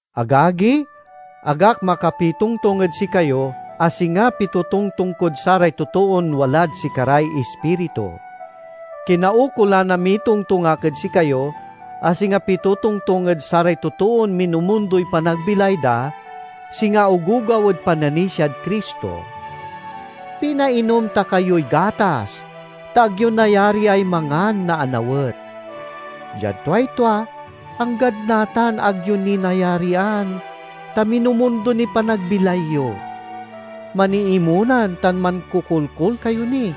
Agagi, ag ak makapitongtong ed sikayo a singa pitotongtong kod saray totoon walad sikaray Ispiritu. Kinaukolan a mitongtong ak ed sikayo a singa pitotongtong ed saray totoon minumundoy panagbilay da, singa ogogaw ed pananisiad Cristo. Pinainom ta kayoy gatas, ta ag yo nayariay mangan na anawet. Diad tuay tua, anggad natan ag yo ni nayarian, ta minumundo niy panagbilay yo. Maniimonan tan mankokolkol kayo ni.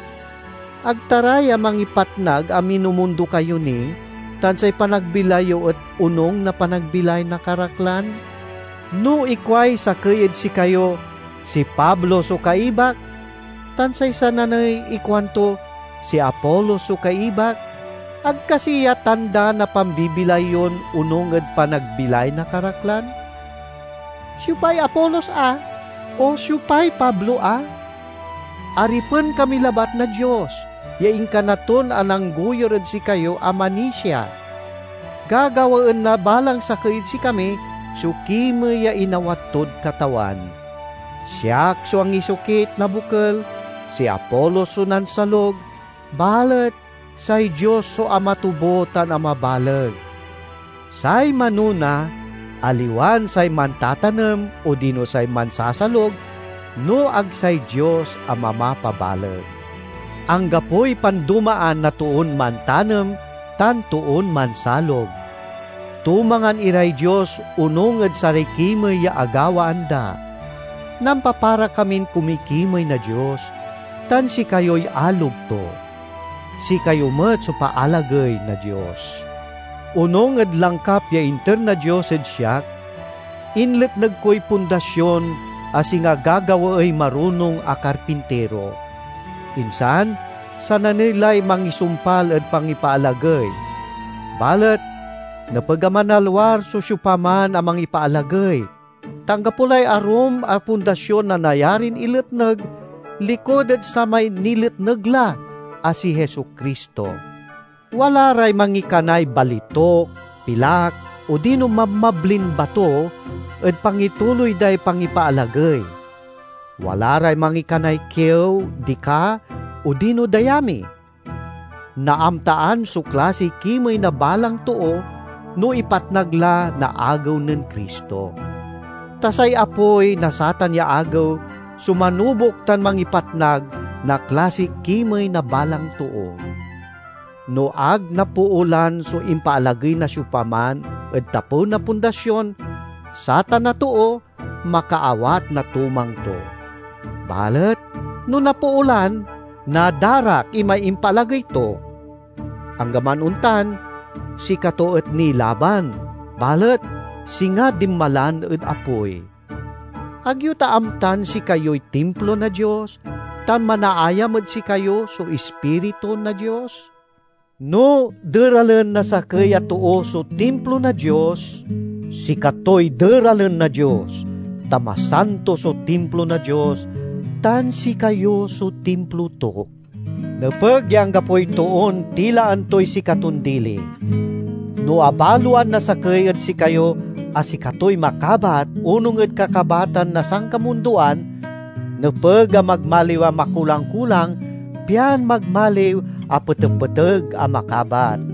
Ag ta ra ya mangipatnag a minumundo kayo ni, tan say panagbilay yo et onung na panagbilay na karaklan? No ikuay sakey ed sikayo, "Si Pablo so kaibak," tan say sananey ikuanto, "Si Apolos so kaibak"—ag kasi ya tanda na pambibilay yon onung ed panagbilay na karaklan? Siopay Apolos a? O siopay Pablo a? Aripen kami labat na Dios, ya inkana ton ananggoyur ed sikayo a manisia. Gagawaen na balang sakey ed sikami so kimey ya inawat tod Katawan. Siak so angisokit na bokel, si Apolos so nansalug, balet say Dios so amatubo tan amabaleg. Say manona aliwan say mantatanem odino say mansasalug, no ag say Dios a mamapabaleg. Anggapoy pandomaan na toon mantanem tan toon mansalug. Tumangan iray Dios onung ed saray kimey ya agawaan da. Nampapara kamin kumikimey na Dios, tan sikayoy alog to. Sikayo met so paalagey na Dios. Onung ed langkap ya inter na Dios ed siak, inletneg koy pundasion a singa gagawaey marunong a karpintiro. Insan sananey lay mangisumpal ed pangipaalagey. Balet nepeg a manalwar so siopaman a mangipaalagey, ta anggapo lay arum a pundasion a nayarin iletneg, likud ed samay niletneg la, a si Jesu-Cristo. Wala ray mangikanay balituk, pilak, odino mabmablin bato ed pangituloy day pangipaalagey; wala ray mangikanay kiew, dika, odino dayami. Naamtaan so klasiy kimey na balang too no ipatnag la na Agew nen Cristo. Ta say apoy na satan ya Agew so manubok tan mangipatnag na klasiy kimey na balang too. No ag napoolan so impaalagey na siopaman ed tapew na pundasion, satan a too makaawat na tumang to. Balet no napoolan, nadarak imay impaalagey to. Anggaman ontan, sikato et nilaban, balet singa dinmalan ed apoy. Ag yo ta amtan sikayoy timplo na Dios tan manaayam ed sikayo so Ispiritu na Dios? No deralen na sakey a too so timplo na Dios, sikatoy deralen na Dios. Ta masanto so timplo na Dios, tan sikayo so timplo to. Nepeg ya anggapoy toon tilaan toy sikaton dili. No abaloan na sakey ed sikayo a sikatoy makabat onung ed kakabatan na sankamundoan, nepeg a magmaliw a makulang-kulang, pian magmaliw a petepeteg a makabat.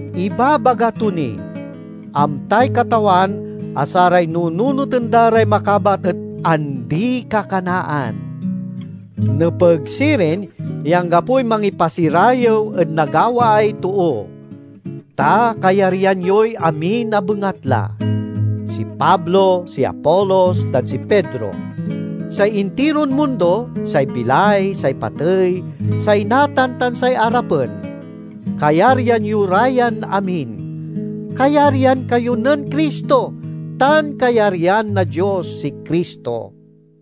Ibabaga to ni, "Amtay Katawan a saray nununoten da ray makabat et andi-kakanaan." Nepeg sirin ya anggapoy mangipasirayew ed nagawaay too. Ta kayaryan yoy amin a bengatla: Si Pablo, si Apolos, tan si Pedro; say intiron mundo, say bilay, say patey, say natan tan say arapen; kayaryan yo ra yan amin. Kayaryan kayo nen Cristo, tan kayaryan na Dios si Cristo.